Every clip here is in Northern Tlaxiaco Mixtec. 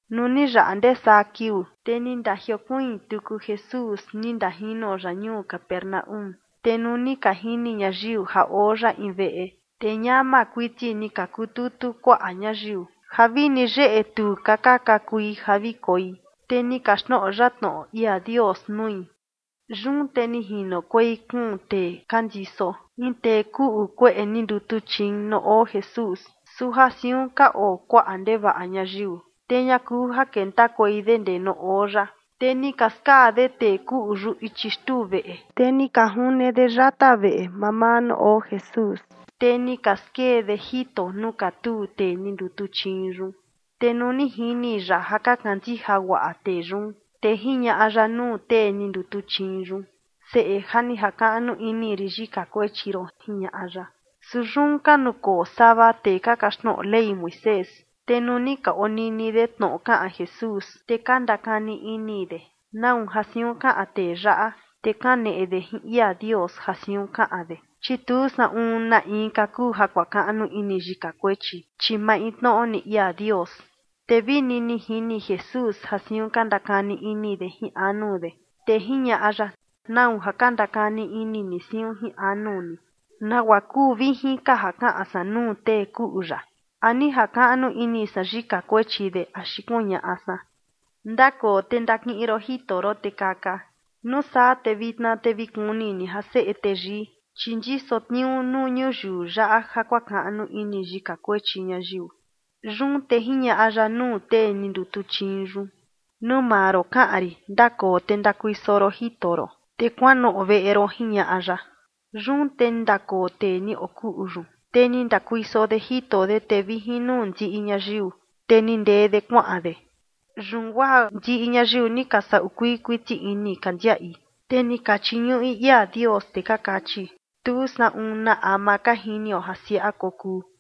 Nuu ni yaꞌa ndee saa kiuu, te ni ndajiokuiin tuku Jesús ni ndajino ya ñuu Capernaúm. Te nuu ni ka jini ñayiu ja oo ya in veꞌe, te ñama kuiti ni ka kututu kuaꞌa ñayiu ja vini yeꞌe tu ka ka kakui ja vi koi, te ni kaxtnoꞌo ya tnoꞌo ia Dios nui. Yun te ni jinokuei kuun tee ka ndiso in tee kuꞌu kueꞌe ni ndutuchiin nuu oo Jesús. Su ja siun ka oo kuaꞌa ndevaꞌa ñayiu, te ña kuu ja kentakuei de ndee nuu oo ya, te ni ka skaa de tee kuꞌu yun ichi xtuu veꞌe, te ni ka june de yata veꞌe mamaa nuu oo Jesús, te ni ka skee de jito nuu katuu tee ni ndutuchiin yun. Te nuu ni jini ya ja ka kandija guaꞌa tee yun, te jiñaꞌa ya nuu tee ni ndutuchiin yun: ―Seꞌe, ja ni jakaꞌnu ini rin yika kuechi ron ―jiñaꞌa ya. Su yun ka nukoo sava tee ka kaxtnoꞌo Ley Moisés, te nuu ni ka onini de tnoꞌo kaꞌan Jesús, te ka ndakani ini de: “¿Nau ja siun kaꞌan tee yaꞌa? Te kaneꞌe de jin ia Dios ja siun kaꞌan de, chi tu saꞌun na inka kuu ja kuakaꞌnu ini yika kuechi, chi maintnoꞌo ni ia Dios.” Te vini ni jini Jesús ja siun ka ndakani ini de jin anu de, te jiñaꞌa ya: ―¿Nau ja ka ndakani ini ni siun jin anu ni? ¿Nagua kuu vijin ka ja kaꞌan san nuu tee kuꞌu yaꞌa? ¿A ni jakaꞌnu ini san yika kuechi de axi kuñaꞌa san: “Ndakoo te ndakiꞌin ron jito ron te kaka”? Nuu saa te vitna te vi kuni ni ja Seꞌe Teyii, chi ndiso tniuu nuu ñuyiu yaꞌa ja kuakaꞌnu ini yika kuechi ñayiu. Yun te jiñaꞌa ya nuu tee ni ndutuchiin yun: ―Nuu maa ron kaꞌan rin, ndakoo te ndakuiso ron jito ron, te kuanoꞌo veꞌe ron ―jiñaꞌa ya. Yun te ni ndakoo tee ni okuꞌu yun, te ni ndakuiso de jito de, te vi jin nuu ndiꞌi ñayiu, te ni ndee de kuaꞌan de. Yun guaa ndiꞌi ñayiu ni ka saꞌu kuii kuiti ini ka ndiaꞌi, te ni ka chiñuꞌi ia Dios, te ka kachi: ―Tu saꞌun na ama ka jinio ja siaꞌa kokuu.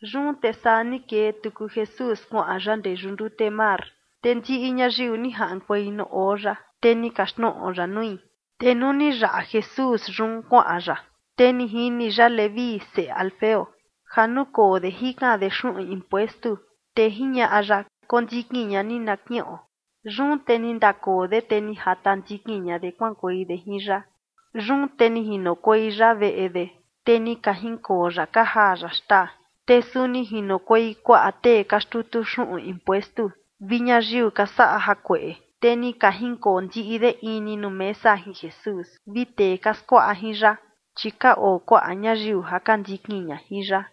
Yun te saa ni kee tuku Jesús kuaꞌan ya ndee yuꞌu ndute mar, te ndiꞌi ñayiu ni jaꞌankuei nuu oo ya, te ni kaxtnoꞌo ya nui. Te nuu ni yaꞌa Jesús yun kuaꞌan ya, te ni jini ya Leví seꞌe Alfeo ja nukoo de jikan de xuꞌun impuestu, te jiñaꞌa ya: ―Kondikin ña ni na kiꞌon. Yun te ni ndakoo de, te ni jata ndikin ña de kuaꞌankuei de jin ya. Yun te ni jinokuei ya veꞌe de, te ni ka jinkoo ya ka jaa ya xtaa. Te suni jinokuei kuaꞌa tee ka xtutu xuꞌun impuestu vi ñayiu ka saꞌa jakueꞌe, te ni ka jinkoo ndiꞌi de in ni nuu mesa jin Jesús vi tee ka skuaꞌa jin ya, chi ka oo kuaꞌa ñayiu ja ka ndikin ña jin ya.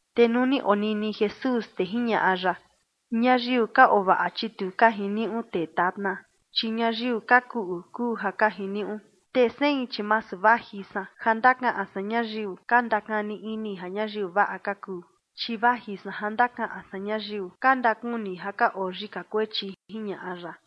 Te nuu ni onini Jesús, te jiñaꞌa ya: ―Ñayiu ka oo vaꞌa, chi tu ka jiniuꞌu tee tatna, chi ñayiu ka kuꞌu kuu ja ka jiniuꞌu. Te sein, chi masu vaji san ja ndakaꞌan san ñayiu ka ndakani ini ja ñayiu vaꞌa ka kuu, chi vaji san ja ndakaꞌan san ñayiu ka ndakuni ja ka oo yika kuechi ―jiñaꞌa ya.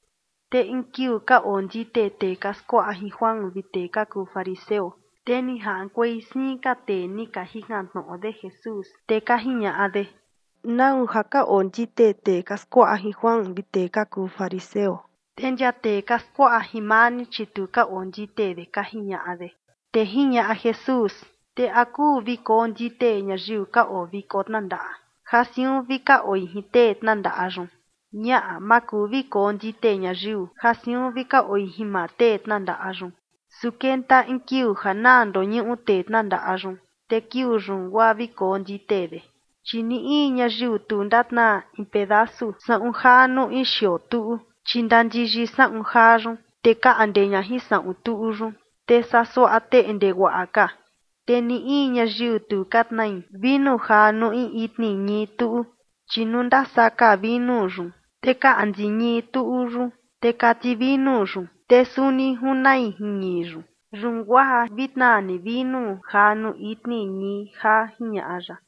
Te in kiuu ka ondite tee ka skuaꞌa jin Juan skuandute vi tee ka kuu fariseo, te ni jaꞌankuei siin ka tee ni ka jikan tnoꞌo de Jesús, te ka jiñaꞌa de: ―¿Nau ja ka ondite tee ka skuaꞌa jin Juan vi tee ka kuu fariseo? Te ndia tee ka skuaꞌa jin maa ni, chi tu ka ondite de ―ka jiñaꞌa de. Te jiñaꞌa Jesús: ―Te ¿a kuu vi kondite ñayiu ka oo viko tnandaꞌa ja siun vi ka oi jin tee tnandaꞌa yun? Ñaꞌa, ma kuu vi kondite ñayiu ja siun vi ka oi jin maa tee tnandaꞌa yun. Su kenta in kiuu ja naa ndoñuꞌu tee tnandaꞌa yun, te kiuu yun guaa vi kondite de. ’Chi ni in ñayiu tu ndatnaa in pedasu saꞌun jaa nuu in xioo tuꞌu, chi ndandiyi saꞌun jaa yun, te kaꞌnde ña jin saꞌun tuꞌu yun, te saa suaꞌa teꞌnde guaꞌa ka. Te ni in ñayiu tu ka tnai vinu jaa nuu in itni ñii tuꞌu, chi nuu ndasaka vinu yun, te kaꞌndi ñii tuꞌu yun, te kati vinu yun, te suni junai jin ñii yun. Yun guaa vi tnaa ni vinu jaa nuu itni ñii jaa ―jiñaꞌa ya.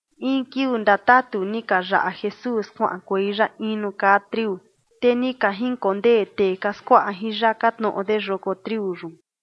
In kiuu ndatatu, ni ka yaꞌa Jesús kuaꞌankuei ya in nuu kaa triu, te ni ka jinkondee tee ka skuaꞌa jin ya ka tnoꞌo de yoko triu yun.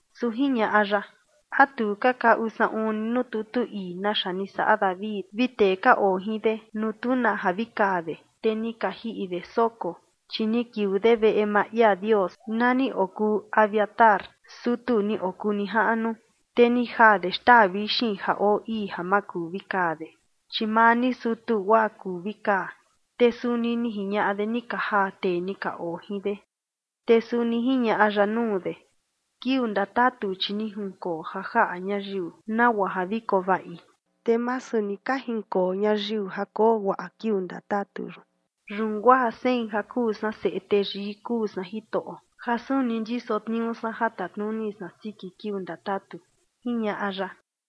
Su jiñaꞌa ya: ―¿A tu ka kaꞌu saꞌun ni nuu tutu ii naxa ni saꞌa David vi tee ka oo jin de nuu tu na ja vi kaa de, te ni ka jiꞌi de soko? Chi ni kiuu de veꞌe maa ia Dios, na ni okuu Abiatar, sutu ni okuu nijaꞌnu, te ni jaa de xtaa vixin ja oo ii ja ma kuu vi kaa de, chi maa ni sutu guaa kuu vi kaa, te suni ni jiñaꞌa de ni ka jaa tee ni ka oo jin de. Te suni jiñaꞌa ya nuu de: ―Kiuu ndatatu, chi ni jinkoo ja jaꞌa ñayiu nagua ja vi koo vaꞌi, te masu ni ka jinkoo ñayiu ja koo guaꞌa kiuu ndatatu yun. Yun guaa sein ja kuu san Seꞌe Teyii kuu san Jitoꞌo ja suni ndiso tniuu san ja tatnuni san siki kiuu ndatatu, ―jiñaꞌa ya.